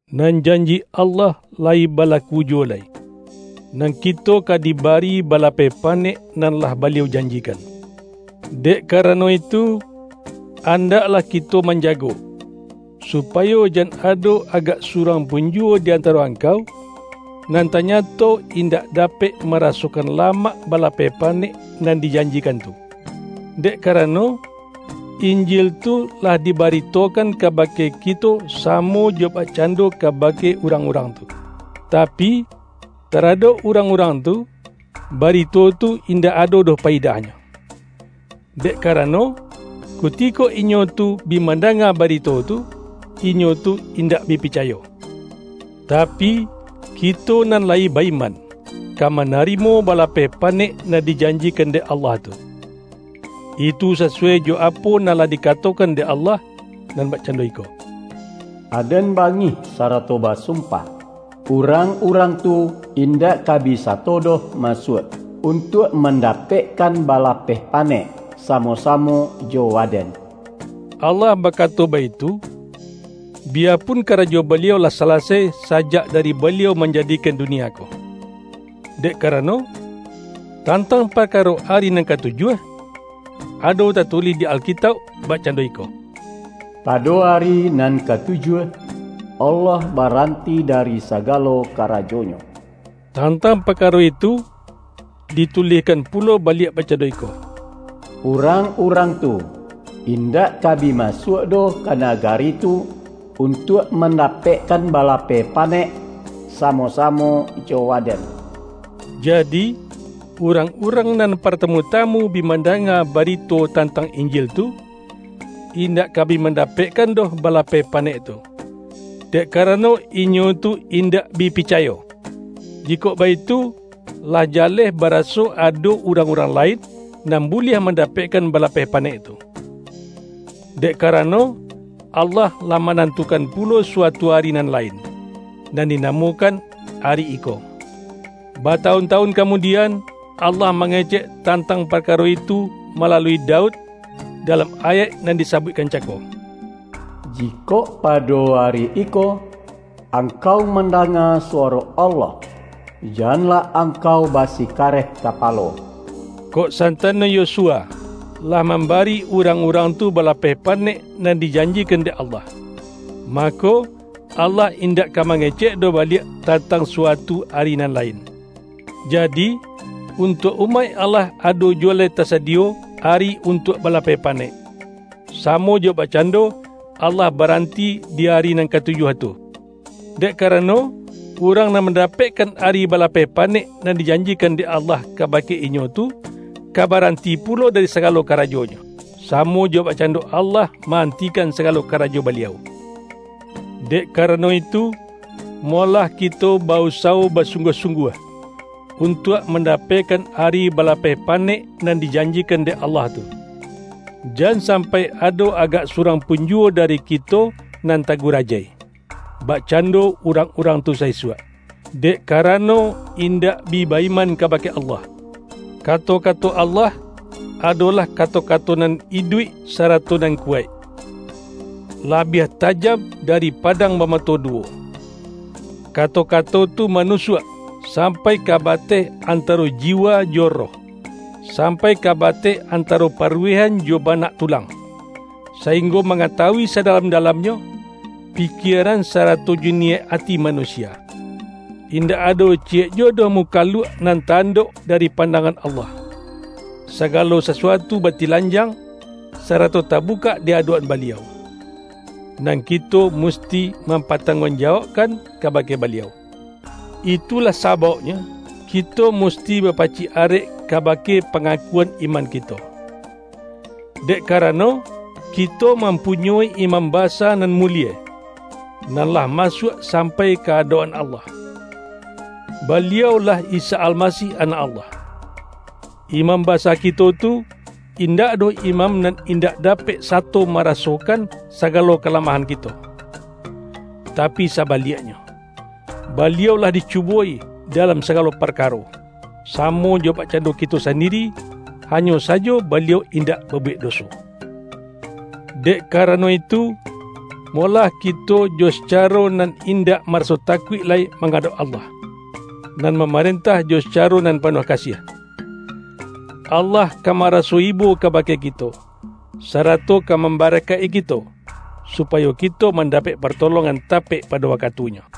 Nan janji Allah layi balaku juwo lai, nan kito ka dibari balapeh pa-nek nan lah Baliau janjikan. Dek ka-rano itu, andaklah kito manjago, su-payo jan ado agak surang pun juwo di antaro angkau, nan tanyato indak dapek marasokan lamak balapeh pa-nek nan dijanjikan tu. Dek karano, Injil tu lah dibaritokan kabake kito sa-mo jo bakcando kabake urang-urang tu. Tapi, taradok urang-urang tu, ba-rito tu indak ado doh payidahnyo. Dek karano, kutiko inyo tu bi manda-nga barito tu, inyo tu indak bi pica-yo. Tapi, kito nan layi ba-iman, ka manarimo balapeh panek nan dijan-jikan dek Allah tu. Itu sasuwai jo apo nan lah dikatokan dek Allah, nan bak-cando iko,”Aden bangih sarato basumpah, ’Urang-urang tu indak ka bi sato doh masuak, untuak mandapekkan balapeh panek samo-samo jo Waden.’” Allah bakato baitu, biyapun karajo Baliau lah salasai sajak dari Baliau manjadikan dunia ko. Dek karano, tantang parkaro ari nan katujuah, ado tatulih di Alkitauk bakcando iko,”Pado ari nan katujuah, Allah baran-ti dari sagalo karajo-Nyo.” Tantang parkaro itu, ditulihkan pulo baliak bakcando iko,”Urang-urang tu in-dak ka bi masuak doh ka nagari tu, untuak mandapekkan balapeh pa-nek samo-samo jo Waden.” Jadi, urang-urang nan partamu-tamu bi mandanga barito tantang Injil tu, in-dak ka bi mandapekkan doh balapeh panek tu, dek karano inyo tu indak bi picayo. Jikok baitu, lah jaleh bara-so ado urang-urang lain, nan buliah mandapekkan balapeh panek tu. Dek karano, Allah lah manantukan pulo suatu ari nan lain, nan dinamokan”Ari Iko”. Batawun-tawun kamudian, Allah mangecek tantang parkaro itu malalui Daud, dalam ayaik nan disa-buikkan cako,”Jikok pado ari iko angkau mandanga suwaro Allah, janlah angkau basikareh kapalo.” Kok santano Yosua lah mambari urang-urang tu balapeh panek nan di-janjikan dek Allah, mako, Allah indak ka mangecek doh baliak tantang sua-tu ari nan lain. Jadi, untuak umaik Allah ado juwo lai tasadiyo ari untuak balapeh panek, samo jo bakcando Allah baranti di ari nan katujuah tu. Dek karano, urang nan mandapek-kan ari balapeh panek nan dijanjikan dek Allah kabake inyo tu, ka baran-ti pulo dari sagalo karajonyo, samo jo bakcando Allah ma-antikan sagalo karajo Baliau. Dek karano itu, mo-lah kito ba-usawo basungguah-sung-guah, untuak mandapekkan ari bala-peh panek nan dijanjikan dek Allah tu. Jan sampai ado agak surang pun juwo dari kito nan tagurajai, bakcan-do urang-urang tu sa-isuak, dek kara-no indak bi ba-iman kabake Allah. Kato-kato Allah, adolah kato-ka-to nan iduik sarato nan kuwaik; la-biah tajam dari padang bamato du-wo. Kato-kato tu manusuak, sampai ka bateh antaro jiwa jo roh; sampai ka bateh antaro paruwehan jo banak tulang, sainggo mangatawui sadalam-dalamnyo, pikieran sarato jo niyaik ati manusia. Indak ado ciyek ju-wo doh mukaluak nan ta-andok dari pandangan Allah. Sagalo sasuatu ba-tilanjang, sarato tabukak di adok-an Baliau. Nan kito musti mampatang-guang-jawaukkan kabake Baliau. Itulah sabauknyo, kito musti ba-pacik arek kabake pangakuan iman ki-to. Dek karano, kito mampunyoi Imam Basa Nan Mulie, nan lah masuak sam-pai ka adok-an Allah — Baliau-lah Isa Almasih Anak Allah. Imam Basa ki-to tu, indak doh imam nan indak da-pek sato marasokan sagalo kalamahan kito. Tapi sabaliaknyo, Baliau lah di-cubo-i dalam sagalo parkaro, samo jo bakcando kito sandiri; hanyo sajo Ba-liau indak babuwek doso! Dek kara-no itu, molah kito jo sacaro nan indak maraso takuik lai mangadauk Allah, nan mamarentah jo sacaro nan pa-nuah kasiah. Allah ka maraso ibo ka-bake kito, sarato ka mambarakaik-i ki-to, supayo kito mandapek partolongan tapek pado wakatunyo.